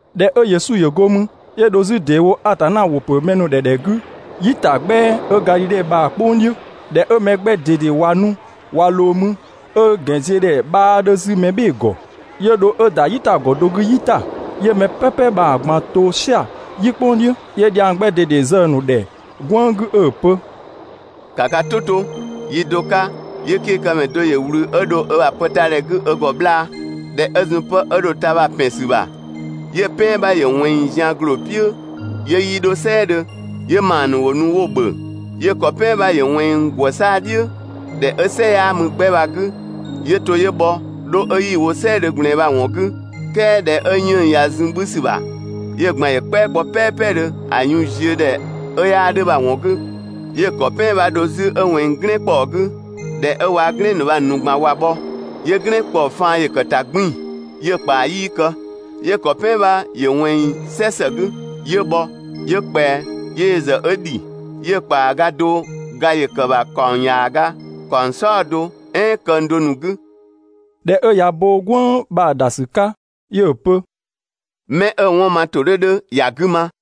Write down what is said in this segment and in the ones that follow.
꞊Dhɛ 'ö Yesu ‑yö go mü, 'yö dho 'zü ‑deewo Atanna ‑wʋ ‑pö mɛ ‑nu ‑dhɛ ‑dhɛ 'gü "yitagbɛa 'ö Gadhidhe bha‑ "kpʋng "dhiʋ̈. ꞊Dhɛ 'ö mɛ 'gbɛ ꞊dede ꞊wa nu ꞊wa ꞊loo mü ('ö ‑gɛnziödhɛ 'bhaa 'dhö 'zü mɛbhɩɩdhe ‑gɔ), 'yö dho 'ö ‑da "yitagɔ do 'gü "yi ‑ta. 'Yö mɛ "pɛpɛ bha‑ ꞊gban to "sia‑ "yi "kpʋng "dhiʋ̈. 'Yö dhiang 'gbɛ ꞊dede zë‑ ‑nu ‑dhɛ "gwënng 'gü 'ö‑ pö: «‑Ka ka "tʋ 'to! Yi do 'ka, 'yö 'kekëmɛ do ‑yö ꞊wlü 'ö dho ö ‑bha pë ta ‑dhɛ 'gü ö ‑gɔ 'bhlaa. ꞊Dhɛ 'ö zun 'pë 'ö dho‑ ta bha‑ ‑pɛn ‑sü ‑bha, 'yö‑ "pɛan 'bha ‑yö ꞊wɛnng zian ‑gloo "piʋ̈ ('yö 'yii 'dho "sɛɛdhö), 'yö ‑maa ‑nu 'wo nu 'wo‑ ‑bhö. 'Yö‑ ‑kɔ "pɛan 'bha ‑yö ꞊wɛnng ‑gwë 'saa‑ "dhiʋ̈, ‑dhɛ 'ö "sɛ 'yaa mü 'gbɛ bha‑ 'gü, 'yö to 'ö bhɔ 'dho 'ö 'yii‑ wo "sɛɛdhö ꞊gblɛɛn bha‑ ‑wɔn 'gü. "Kɛɛ ꞊dhɛ 'ö 'yënng‑ ꞊ya zun 'bhü ‑sü ‑bha, 'yö‑ ꞊gban ‑yö "kpɛa kpɔ "pɛɛpɛdhö ‑a yun ziö ‑dhɛ 'ö 'yaa 'dhö bha‑ ‑wɔn 'gü. 'Yö‑ ‑kɔ "pɛan 'bha‑ dho 'zü 'ö ꞊wɛnng "glɛɛn ‑kpɔɔ 'gü. ꞊Dhɛ 'ö waa‑ "glɛn ‑nu bha‑ ‑nu ꞊gban ꞊wa bhɔ, 'yö "glɛɛn ‑kpɔɔ faan ‑yö ‑kë ‑ta 'gbiin‑ 'yö‑ ‑kpaa 'yii kë. 'Yö‑ ‑kɔ "pɛan 'bha ‑yö ꞊wɛnng "sɛ ‑së 'gü, 'yö bhɔ, 'yö ꞊kpɛa, 'yö yö ‑zë 'ö ‑dhi. 'Yö‑ ‑kpaaga do ga ‑yö ‑kë ‑bha ‑kaɔng ‑yaaga, ‑kaɔng "saɔdo, "ɛɛn këng do ‑nu 'gü. ꞊Dhɛ 'ö ꞊ya ö bo "gwënng bha‑ ‑da ‑sü 'ka, 'yö‑ pö: «'Mɛ 'ö‑ 'wɔn ma ‑tʋ 'dhö 'dhö ‑ya 'gü ma!»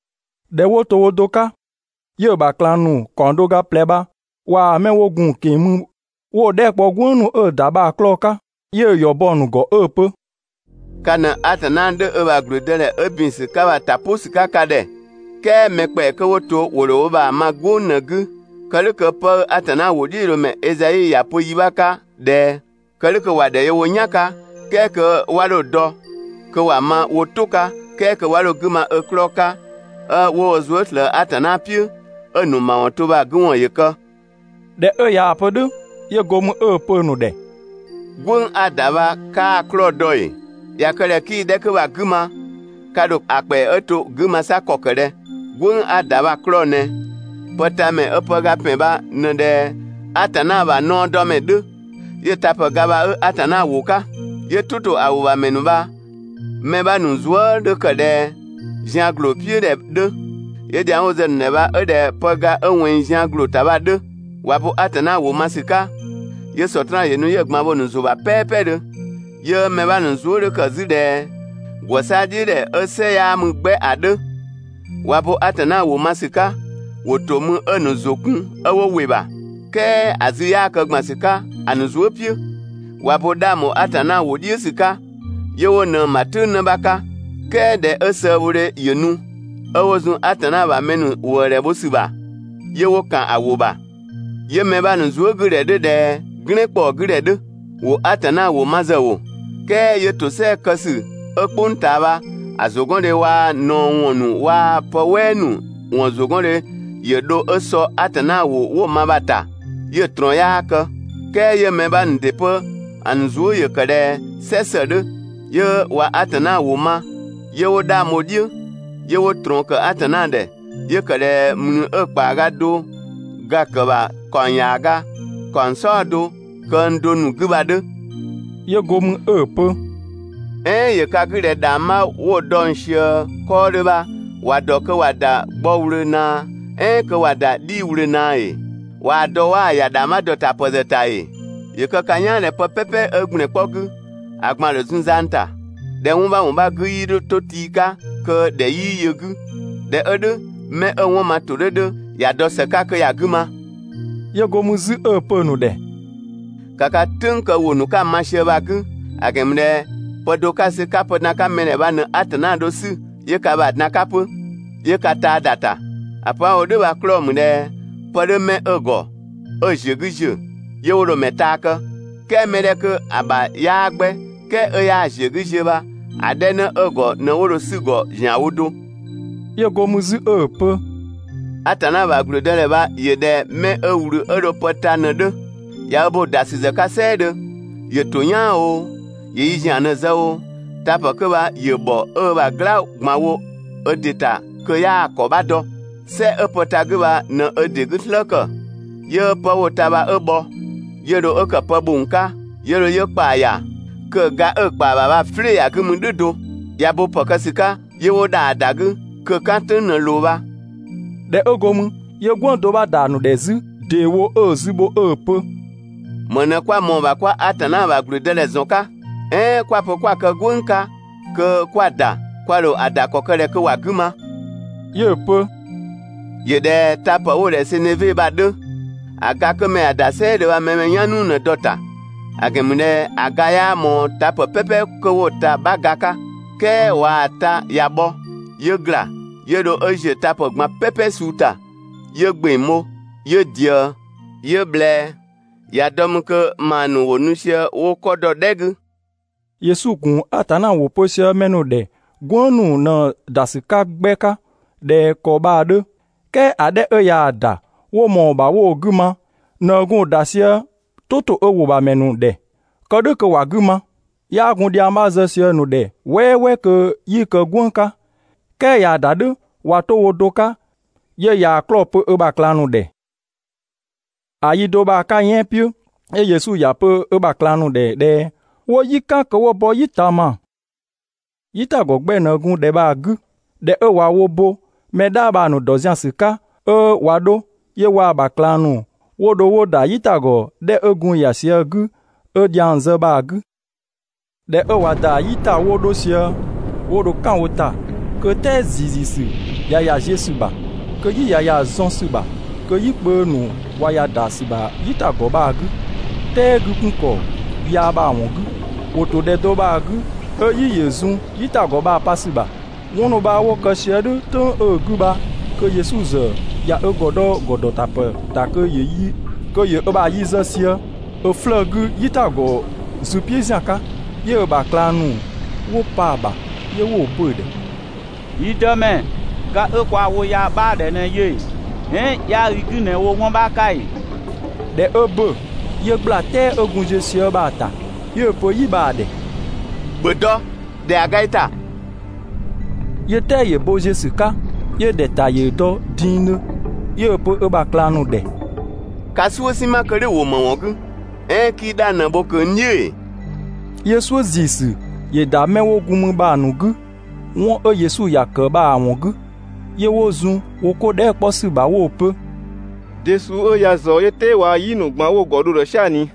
꞊Dhɛ 'wo to wo do 'ka, 'yö‑ ‑bha ꞊klang ‑nu ‑kaɔng do ga ꞊plɛ bha ‑waa 'mɛ 'wo gun‑ ꞊keng‑ mü 'wo‑ dhɛɛ" kpɔ "gwënng ‑nu 'ö‑ ‑da bha‑ 'klɔɔ‑ 'ka. 'Yö‑ ‑yɔ bɔ‑ ‑nu ‑gɔ 'ö‑ pö: «Ka ꞊në Atanna 'dhö ö ‑bha ‑gblüdëdhɛ 'ö ‑bin ‑sü 'ka bha‑ ‑ta "pʋ ‑sü 'ka ka ‑dhɛ, "kɛɛ 'mɛ ‑kpɛa 'kö 'wo to ‑wo ‑dho wo ‑bha ma "gwënng ꞊në‑ 'gü. Kë "dhʋ̈ kö ('pë 'ö Atanna ‑wʋdhiʋ̈loomɛ Ezai ‑ya pö yi 'bha 'ka ꞊dhɛ: Kë "dhʋ̈ kö) ‑Wa ‑dhɛ yö wo "yan 'ka, "kɛɛ kö 'wa 'dho‑ dɔ, kö ‑wa ma wo "tʋ 'ka, "kɛɛ kö 'wa 'dho‑ 'gü ma ö 'klɔɔ‑ 'ka 'ö 'wo wo zuë" ꞊slëë Atanna "piʋ̈, 'ö‑ ‑nu ‑mawɔn 'to bha‑ 'gü ‑wɔn ‑yö kë. ꞊Dhɛ 'ö ꞊yaa‑ pö "dhʋ̈, 'yö go mü 'ö‑ pö‑ ‑nu ‑dhɛ: «"Gwënng 'a‑ ‑da bha 'kaa‑ 'klɔɔ‑ dɔ ‑ee? ꞊Ya kë ꞊dhɛ 'kii‑ 'dhɛ 'kö bha‑ 'gü ma, ka ‑dho ‑a ‑kpɛa 'ö to‑ 'gü ma 'sa ‑kɔ ‑kë ꞊dhɛ? "Gwënng 'a‑ ‑da bha‑ 'klɔɔ‑ ꞊nɛ: Pëtamɛ 'ö pëga ‑pɛn bha ꞊në ꞊dhɛ Atanna ‑bha naɔdɔmɛ 'dhö, 'yö‑ tapë ga bha 'ö‑ Atanna ‑wʋ 'ka. 'Yö "tʋ ‑to ‑a ‑wʋ ‑bha ‑mɛ ‑nu bha‑ mɛ 'bha ‑nu zuë" 'dhö ꞊dhɛ zian ‑gloo "piʋ̈ ‑dhɛ 'dhö. 'Yö dhiang 'wo‑ zë‑ ‑nu ‑dhɛ bha 'ö ꞊dhɛ pëga 'ö ꞊wɛnng zian ‑gloo ‑ta bha‑ 'dhö. ꞊Wa bo Atanna ‑wʋ ma ‑sü 'ka, 'yö Sɔtraan ‑yö nu 'yö‑ ꞊gban bho‑ ‑nu ‑zʋ ‑bha "pɛɛpɛdhö. 'Yö‑ mɛ 'bha ‑nu zuë" 'dhö ‑kë 'zü ꞊dhɛ ‑gwë 'saa‑ "dhiʋ̈ ‑dhɛ 'ö "sɛ 'yaa mü 'gbɛ ‑a 'dhö. ꞊Wa bo Atanna ‑wʋ ma ‑sü 'ka, ‑wo ‑to mü 'ö‑ ‑nu ‑zʋ kun 'ö 'wo ‑wɩ ‑bha. "Kɛɛ ‑a zü 'yaa kë ‑gban ‑sü 'ka ‑a ‑nu zuë" "piʋ̈. ꞊Wa bo 'dhang ‑bho Atanna ‑wʋ "dhiʋ̈ ‑sü 'ka, 'yö 'wo ꞊nëng‑ ‑bha "tʋ̈ng 'në 'bha 'ka, "kɛɛ ꞊dhɛ 'ö sëëbhodhe ‑yö nu, 'ö 'wo zun Atanna ‑bha mɛ ‑nu ‑wëëdhɛ bho ‑sü ‑bha, 'yö 'wo ‑kan ‑a ‑wʋ ‑bha. 'Yö‑ mɛ 'bha ‑nu zuë" 'gü ‑dhɛ 'dhö ꞊dhɛ "glɛɛn ‑kpɔɔ 'gü ‑dhɛ 'dhö; ‑wo Atanna ‑wʋ ma ‑zë ‑wo, "kɛɛ 'yö ‑tosɛa kë ‑sü 'ö "kpʋng ꞊taa bha‑ ‑zʋgɔndhe waa‑ ꞊naɔ ‑wɔn ‑nu waa‑ pë "wɛɛ ‑nu ‑wɔn ‑zʋgɔndhe ‑yö dho 'ö sɔ Atanna ‑wʋ 'wo‑ ma bha‑ ‑ta 'yö‑ ꞊trɔɔn 'yaa kë. "Kɛɛ 'yö‑ mɛ 'bha ‑nu ‑dɩ 'pö‑ ‑nu zuë" ‑yö ‑kë ꞊dhɛ "sɛ ‑së 'dhö, 'yö ꞊wa Atanna ‑wʋ ma, 'yö 'wo 'dhang bho‑ "dhiʋ̈, 'yö 'wo ꞊trɔɔn ‑kë Atanna ‑dhɛ, 'yö ‑kë ꞊dhɛ ‑mlü 'ö‑ ‑kpaaga do ga‑ ‑kë ‑bha ‑kaɔng ‑yaaga, ‑kaɔng "saɔdo, këng do ‑nu 'gü bha‑ 'dhö. 'Yö go mü 'ö‑ pö: «"Ɛɛn ‑yö ka 'gü ꞊dhɛ ‑dhangbha 'wo dɔng ꞊sië 'kɔɔdhö bha, ‑wa ‑dɔ kö ‑wa ‑da gbɔ ꞊wlöö ꞊naa, "ɛɛn kö ‑wa ‑da 'dhii‑ ꞊wlöö ꞊naa ‑ee? ꞊Waa‑ dɔ 'waa‑ ‑ya ‑dhangbha ‑dɔtapë ‑zë ‑ta ‑ee? ‑Yö kë ka "yaan ꞊dhɛ pë "pɛpɛ 'ö ‑gblɛn 'kpɔ 'gü, ‑a ꞊gban ‑dho zun zang ‑ta. ꞊Dhɛ 'wɔn 'bha ‑wɔn 'bha 'gü 'yii 'dho 'to tii 'ka kö ‑dhɛ 'yii yö‑ 'gü. ꞊Dhɛ 'ö "dhʋ̈, 'mɛ 'ö‑ 'wɔn ma ‑tʋ 'dhö 'dhö ‑ya dɔ ‑së 'ka kö ‑ya 'gü ma!» 'Yö go mü 'zü 'ö‑ pö‑ ‑nu ‑dhɛ: «‑Ka ka "tʋ̈ng kë ‑wʋ ‑nu 'ka‑ ma sië bha‑ 'gü, ‑a ‑gɛn ‑mü ꞊dhɛ pë do 'ka‑ sü 'ka pë dan‑ 'ka mɛ ‑dhɛ bha ꞊në Atanna dho‑ 'sü 'yö ka ‑bha dan‑ 'ka 'pö, 'yö ka taa ‑da ‑ta. ‑A pö 'a‑ wo "dhʋ̈ bha‑ 'klɔɔ‑ ‑mü ꞊dhɛ pë 'dhö 'mɛ 'ö‑ ‑gɔ 'ö‑ ‑ziö 'gü ‑ziö, 'yö 'wo dho‑ ‑mɛ taa kë, "kɛɛ mɛ 'dhɛ 'kö‑ ‑bha 'yaa 'gbɛ, "kɛɛ 'ö 'yaa‑ ‑ziö 'gü ziö bha, ‑a 'dhɛ 'në 'ö‑ ‑gɔ ꞊në 'wo dho‑ 'sü‑ ‑gɔ ‑zianwo do.» 'Yö go mü 'zü 'ö‑ pö: «Atanna ‑bha ‑gblüdëdhɛ bha ‑yö ꞊dhɛ mɛ 'ö ꞊wlü 'ö dho 'ö pë ta ꞊në‑ 'dhö. ꞊Ya ö bo‑ ‑da ‑sü ‑zë 'ka "sɛɛdhö, ‑yö ‑to "yaan oo, ‑yö yi ‑zian ꞊në zë oo, tapë 'kö bha ‑yö ‑bhɔ 'ö ö ‑bha "gla ꞊gban wo ö ‑dɩ ‑ta kö 'yaa‑ ‑kɔ 'bha dɔ. "Sɛ 'ö pë ta‑ 'gü bha ꞊në ö ‑dɩ 'gü "slë ‑kë, 'yö 'pë 'wo‑ ta bha 'ö bhɔ, 'yö dho 'ö ‑kë pë ‑bhong 'ka, 'yö dho 'yö ö ‑kpaa ‑ya, kö‑ ga 'ö‑ ‑kpaa ‑bha bha‑ "flɩɩ‑ ‑ya 'gü mü "dhʋ̈ do. ꞊Ya bo ‑pë kë ‑sü 'ka, 'yö 'wo ‑dhaa ‑da 'gü, kö‑ "kan "tʋ̈ng ꞊në ꞊loo bha.» ꞊Dhɛ 'ö go mü, 'yö "gwënng do 'bha ‑da ‑a ‑nu ‑dhɛ 'zü ‑deewo 'ö‑ zü bho 'ö‑ pö: «‑Më ꞊në 'kwa ꞊mɔɔ‑ ‑bha 'kwa Atanna ‑bha ‑gblüdëdhɛ ‑zɔn 'ka? "Ɛɛn 'kwa‑ pö 'kwa‑ kë "gwënng 'ka kö 'kwa‑ ‑da, kwa ‑dho ‑a ‑da ‑kɔ kë ꞊dhɛ kö ‑wa 'gü ma?» 'Yö‑ pö: «‑Yö ꞊dhɛ tapë 'wo‑ ‑dhɛ seneve bha‑ 'dhö. ‑A ga 'kö mɛ ‑ya ‑da "sɛɛdhö bha mɛ‑ mɛ "yan "nuu ꞊në‑ dɔ‑ ‑ta, ‑a ‑gɛn ‑mü ꞊dhɛ ‑a ga 'yaa ꞊mɔɔ tapë "pɛpɛ 'kö 'wo‑ ta‑ 'bha ga 'ka. "Kɛɛ ꞊waa‑ ta ꞊ya bhɔ, 'yö ‑gla, 'yö dho 'ö ziö tapë ꞊gban "pɛpɛ suu ‑ta. 'Yö ‑gbeng bho, 'yö ꞊diëë, 'yö ꞊bhlɛɛ, ꞊ya dɔ mü kö ‑maa ‑nu ‑wo nu sië 'wo 'kɔ dɔ‑ "dhɛ 'gü. Yesu ‑gun Atanna ‑wʋ pö sië mɛ ‑nu ‑dhɛ "gwënng ‑nu ꞊në‑ ‑da ‑sü 'ka 'gbɛ 'ka ꞊dhɛ ‑kɔ bha‑ 'dhö, "kɛɛ ‑a 'dhɛ 'ö ꞊yaa‑ ‑da 'wo ꞊mɔɔ‑ ‑bha 'wo‑ 'gü ma ꞊në 'ö gun‑ ‑da sië "tʋ ‑to ö ‑wʋ ‑bha ‑mɛ ‑nu ‑dhɛ, kë "dhʋ̈ kö ‑wa 'gü ma. 'Yaa gun dhiang 'bha zë sië‑ ‑nu ‑dhɛ "wɛɛwɛɛ kö 'yii‑ kë "gwënng 'ka, "kɛɛ ꞊yaa‑ ‑da "dhʋ̈, ꞊wa 'to wo do 'ka, 'yö ꞊yaa‑ 'klɔɔ‑ pö ö ‑bha ꞊klang ‑nu ‑dhɛ. ‑A yi do bha‑ 'ka yɛan" "piʋ̈, 'yö Yesu ‑ya pö ö ‑bha ꞊klang ‑nu ‑dhɛ ꞊dhɛ 'wo "yi "kan kö 'wo bɔ "yi ꞊taama. "Yitagɔ 'gbɛ ꞊në gun ‑dhɛ bha‑ 'gü. ꞊Dhɛ 'ö ꞊wa wo bo mɛ "dhaa bha‑ ‑nu ‑dɔ zian ‑sü 'ka 'ö ꞊wa 'dho, 'yö waa‑ ‑bha ꞊klang ‑nu 'wo dho 'wo ‑da "yitagɔ 'dhɛ 'ö gun ‑ya sië‑ 'gü, 'ö dhiang zë bha‑ 'gü. ꞊Dhɛ 'ö ꞊wa ‑da "yi ‑ta 'wo 'dho sië, 'wo dho "kan wo ‑ta kö "tɛɛ ‑ziiziisü ꞊ya ‑ya ziö ‑sü ‑bha. Kö "yi ꞊ya ‑ya zɔn ‑sü ‑bha, kö "yikpö ‑nu ꞊wa ‑ya ‑da ‑sü ‑bha "yitagɔ bha‑ 'gü, "tɛɛ 'gü 'kun ‑kɔ yaa bha‑ ‑wɔn 'gü, ‑wo ‑to ‑dhɛ do bha‑ 'gü 'ö "yi ‑yö zun "yitagɔ bha‑ pa ‑sü ‑bha. 'Wɔn ‑nu bha 'wo kë sië "dhʋ̈ "tʋ̈ng 'ö‑ 'gü bha kö Yesu ‑zë ꞊ya ö ‑gɔ dɔ ‑gɔdɔtapë ‑ta kö ‑yö ö ‑bha yi zë sië ö 'flëë‑ 'gü "yitagɔ zü "piʋ̈ ‑zian 'ka. 'Yö‑ ‑bha ꞊klang ‑nu 'wo pa‑ ‑bha, 'yö 'wo‑ pö‑ ‑dhɛ: «Yi Dëmɛ, ga 'ö kwaa‑ wo ya 'bhaa‑ ‑dhɛ ꞊në yö ‑ee? "Ɛɛn 'yaa i 'gü ꞊në wo 'wɔn 'bha 'ka ‑ee?» ꞊Dhɛ 'ö ‑bö, 'yö ꞊gbla "tɛɛ 'ö gun ziö sië bha‑ ‑ta. 'Yö‑ pö "yi bha‑ ‑dhɛ: «‑Bhö dɔ! ‑Dhɛa ga i ‑ta!» 'Yö "tɛɛ ‑yö bo ziö ‑sü 'ka, 'yö ‑dhɛta ‑yö dɔ dingdhö. 'Yö‑ pö ö ‑bha ꞊klang ‑nu ‑dhɛ: «Ka "suʋ̈ "sinma kö "dhʋ̈‑ ‑wo ‑më ‑wɔn 'gü? "Ɛɛn 'kii 'dhang ꞊në bho ꞊kö n "dhiʋ̈ ‑ee? 'Yö "suʋ̈ ‑ziisü ‑yö ‑da 'mɛ 'wo gun mü bha‑ ‑nu 'gü 'wɔn 'ö Yesu ‑ya ‑kë bha‑ ‑wɔn 'gü. 'Yö 'wo zun wo 'ko dhɛɛ" 'kpɔ ‑sü ‑bha 'wo‑ pö: «De suu 'ö ya ꞊zɔɔ 'yö "tɛɛ waa‑ "yi ‑nu ꞊gban 'wo wo ‑gɔ dho‑ ‑dhɛ "sia‑ ꞊ni?»